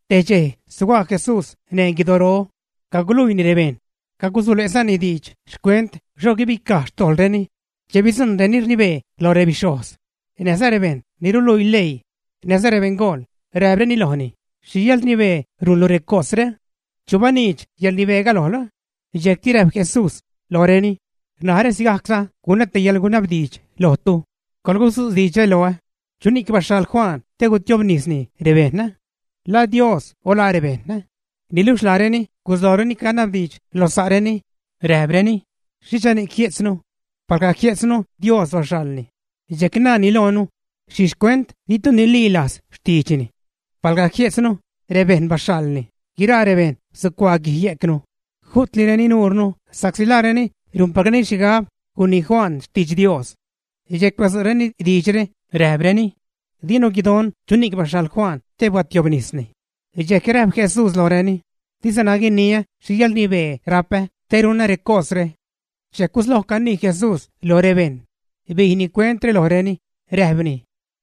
Te dxej suga' Jesús neṉ guidoro, caguluiini rebejṉ, cagusule'zani diidx xcuent xho guibicaj xtojḻreni, che bidzujṉ reni rnibee loj rebixhojz näjza rebejṉ ni ruluii leii näjza rebeṉgool, räjpreni lojni: ―¿Xhi yäḻrnibee rujnlu recosre? ¿Chu baniidx yäḻrnibeega lojlu? Dxejcti räjp Jesús lojreni: ―Narä sigajcza gunä te yäḻgunabdiidx lojtu, coḻgudzu' diidxre loä, ¿chuni'c baxhaḻ Juan te gutiobnisni rebejṉ? ¿La Dios o la rebejṉ, ä? Niluxh laareni guslojreni canabdiidx lo sa'reni, räjpreni: ―¿Xhichani'c jie'tznu? Palga jie'tznu Dios baxhaḻni, dxejc naani loonu: “¿Xhixhcuent ditu ninilajz xtiidxni?” Palga jie'tznu: “Rebejṉ baxhaḻni”, guiraa rebejṉ sucuaa guij yejcnu, ju'tlireni nuurnu sa'csi laareni rujnpacreni xhigab gunii Juan xtidx Dios. Dxejc badzu'reni diidxre, räjpreni: ―Dinu guidon chuni'c baxhaḻ Juan te biädtiobnisni. Dxejc räjp Jesús lojreni: ―Dizana guiniä xhi yäḻrnibee rapä te runä recosre. Dxejc gusloj canii Jesús loj rebejṉ, bijni cuentre lojreni, räjpni: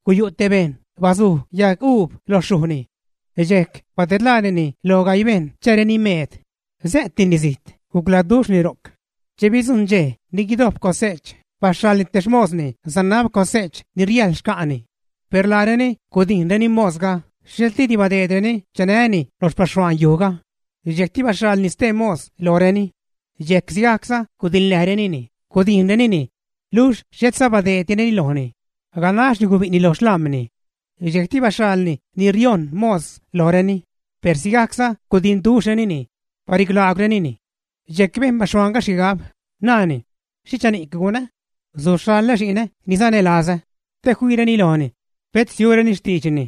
―Guyu' te bejṉ bazuj yaguub lo xyujni. Dxejc badedlaanini lo gaii bejṉ chääreni meed, sä'tnini zijt, gucladuxhni ro'c. Che bidzujṉ dxej ni guidojp cose'ch, baxhaḻni te xmosni sanab cose'ch ni riäjḻ xca'ni. Per laareni gudijnreni mosga, xhetliidi badeedreni chanäni lo xpaxhuaan yujga. Dxejcti baxhaḻni stee mos lojreni. Dxejc sigajcza gudiḻnäjrenini, gudijnrenini, luxh xhetza badeeddireni lojni, ganaxni gubi'ni lo xlam̲ni. Dxejcti baxhaḻni ni riojṉ mos lojreni, per sigajcza gudinduxhrenini, barilaagwrenini. ’Dxejc bejn baxhuaanga xhigab, naani: “¿Xhichani'c gunä? Suxhaḻä xi'nä ni sanälazä; che fiireni lojni, pet siureni xtiidxni.”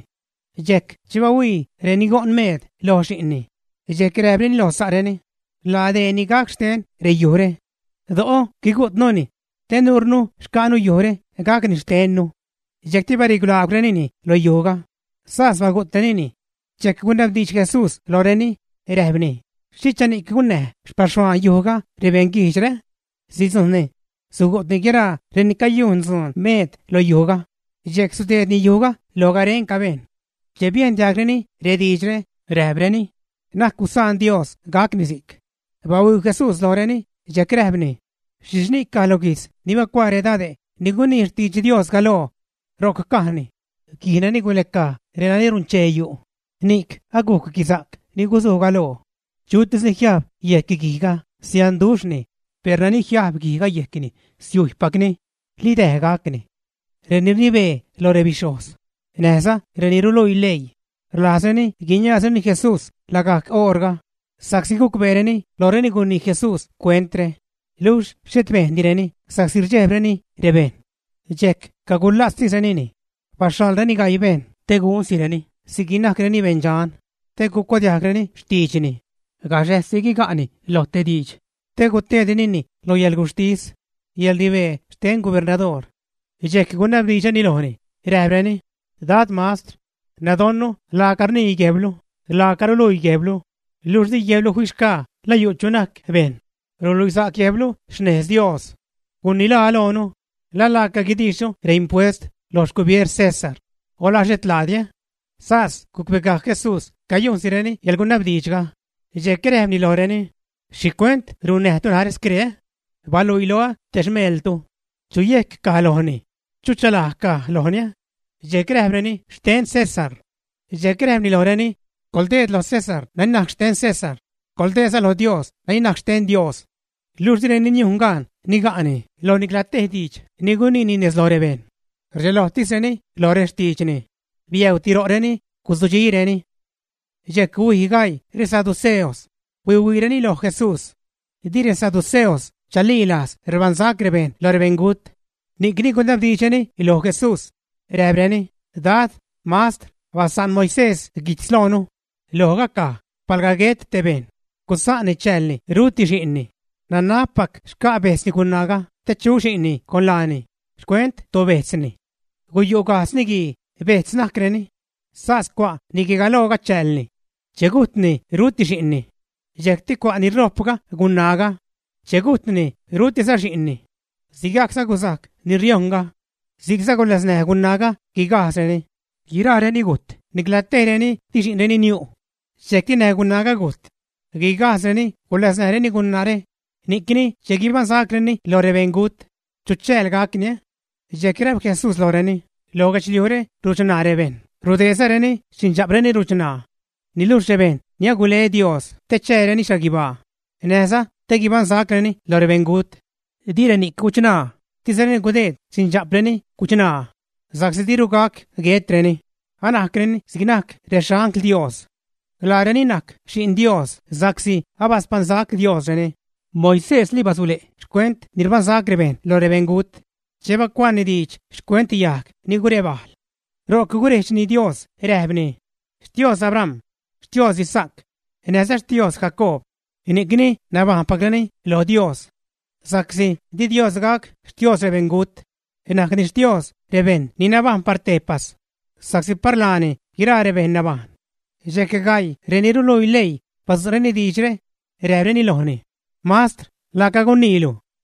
Dxejc che bahuii reni go'n-meed lo xi'nni, dxejc räjpreni lo sa'reni: “Laa deeni gac xtenni reyujre. Do'o guigu'tnuni te nuurnu xca'nu yujre gacni xtennu.” Dxejcti barilaagwrenini lo yujga, sas bagu'trenini. Dxejc gunabdiidx Jesús lojreni, räjpni: ―¿Xhichani'c gunnäj xpaxhuaan yujga rebeṉ guijdxre, ä? Sidzujṉni, sugu'tni guiraa reni cayujn dzun-meed lo yujga, dxejc sudeedni yujga lo garenca bejṉ. Che biejn diajgreni rediidxre, räjpreni: ―¡Na'c gusaan Dios gacni si'c! Bahuii Jesús lojreni, dxejc räjpni: ―¿Xhixhni'c caj lo guijtz ni bacuaa redade' ni gunii xtidx Dios galoo? Ro'c cajni: Guij nani guläcaj renani runchee yu', ni'c agujc guisa'c ni guzuj galoo. Chutis ni jiajb yejc guijga, sianduxhni, per nani jiajb guijga yejcni siujypacni, li däj gacni. Reni rnibee loj rebixhojz, näjza reni ruluii leii rlajzreni guiniaazreni Jesús lagajc oṟga, sa'csi gucbeereni lojreni gunii Jesús cuentre, luxh xhet bejndireni sa'csi rdxejbreni rebejṉ. Dxejc cagula'tztisrenini, baxhaḻreni gaii bejṉ te gunsireni si'c ni najcreni beṉdxan, te gucuadiajgreni xtiidxni don gaxäjssi guiga'ni lo te diidx te guteedrenini lo yäḻguxhtis, yäḻrnibee xte gubernadoor. Dxejc gunabdiidxreni lojni, räjpreni: ―Dad, Mastr, nadonnu laaca rnii guejblu, laaca ruluii guejblu, luxh di guejblu fixgaa la yu' chu najc bejṉ, ruluisa'c guejblu xnez lo Dios. Gunilaa loonu, ¿la laaca guidiixnu reimpuest loj xcubieer César o la xhet laadini, ä? Sas gucbegajc Jesús cayujnsireni yäḻgunabdiidxga, dxejc räjpni lojreni: ―¿Xhicuent runnäjtu narä scree? Baluii loä te xmeeltu. ¿Chucha yejc caj lojni, chucha laj caj lojni? Dxejc räjpreni: ―Xten César. Dxejc räjpni lojreni: ―Coḻdeed lo César nani najc xten César; coḻdeedza lo Dios nani najc xten Dios. Luxh direni niujn gaan niga'ni loj nicla te diidx ni guniini nez loj rebejṉ. Rdxelojtisreni lo rextiidxni, biäuti ro'reni, guzudxireni. Dxejc huij gaii resaduceos huihuiireni loj Jesús. Di resaduceos chalilajz rbaṉsac bejṉ lo rebeṉgut. Ni'cni gunabdiidxreni loj Jesús, räjpreni: ―Dad, Mastr, basa'n Moisés guijtz loonu, lojga caj: “Palga guet te bejṉ, gusaanni chäälni ruti xi'nni, nanabpac xca' bejtzni gunaaga te chu xi'nni con laani xcuent tobejtzni.” Guyu' gajdz niguii, bejtz najcreni. Sas cua' niguigalooga chäälni. Che gujtni ruti xi'nni. Dxejcti cua' ni ṟojpga gunaaga. Che gujtni, rutiza xi'nni. Sigajcza guzajc ni riojnga. Si'cza guläsnäj gunaaga guigajdzreni. Guiraareni gujt, nicla tejreni di xi'nreni niu'. Dxejcti näj gunaaga gujt. Guigajdzreni guläsnäjreni gunaare, ni'cni, che guibaṉsacreni lo rebeṉgut, ¿chu chääl gacni, ä? Dxejc räjp Jesús lojreni: ―Lo guedxliujre ruchṉaa rebejṉ, rudeedzareni xindxa'preni ruchṉaa. Niluxh rebejṉ ni agule Dios te chääreni xhaguibaa, näjza te guibaṉsacreni loj rebeṉgut, di reni'c guchṉaa, dizareni gudeed xindxa'preni guchṉaa, sa'csi diru gac guetreni, anajcreni si'c najc rexangl Dios. Laareni najc xi'n Dios sa'csi abaspaṉsac Diosreni. Moisésli basule' xcuent ni rbaṉsac rebeṉ loj rebeṉgut che bacuaani diidx xcuent yajg ni gurebajl. Ro'c gurejdxni Dios räjpni: “Xtios Abram, Xtios Isaac, näjza Xtios Jacoob”, ni'cni nabajṉpacreni lo Dios. Sa'csi di Dios gac Xtios rebeṉgut; najcni Xtios rebejṉ ni nabajṉ par tejpas, sa'csi par laani guiraa rebejṉ nabajṉ. Dxejc gaii reni ruluii leii badzu'reni diidxre, räjpreni lojni: ―Mastr, laaca guniilu.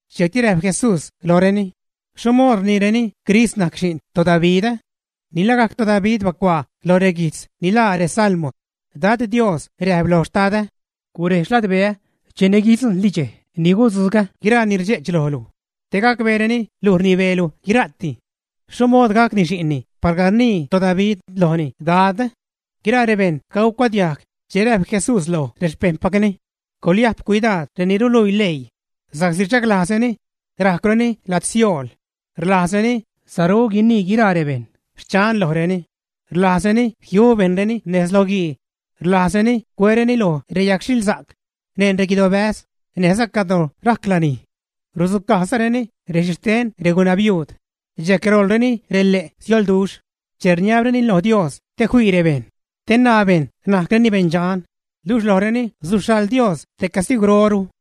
Dxejcti räjp Jesús lojreni: ―¿Xho mood rniireni Crist najc xi'n toDavid, ä? Ni lagajc toDavid bacuaa lo reguijtz ni laa reSalmo: Dad Dios räjp lo Xtadä: “Gurej xladbeä cheni guidzujṉli dxej ni gudzugä guiraa ni rdxe'ch lojlu te gacbeereni luj rnibeelu guira'ti.” ¿Xho mood gacni xi'nni palga rnii toDavid lojni “Dad”? Guiraa rebejṉ cagucuadiajg che räjp Jesús loj rexpejṉpacni: ―Coḻyajp cuidaad reni ruluii leii, sa'csi rdxaglajzreni rajcwreni lajd siool, rlajzreni saru guinii guiraa rebejṉ “xchan” lojreni, rlajzreni jiu bejṉreni nez loguii, rlajzreni cuereni lo reyagxhilsa'c neṉ reguidobäz, näjza cadro rajc lanij. Rudzucajzareni rexhixten regunabiuud, dxejc roḻreni rele' siolduxh che rniabreni lo Dios te fii rebejṉ, te naa bejṉ najcreni beṉdxan, luxh lojreni suxhaḻ Dios te castigwroru.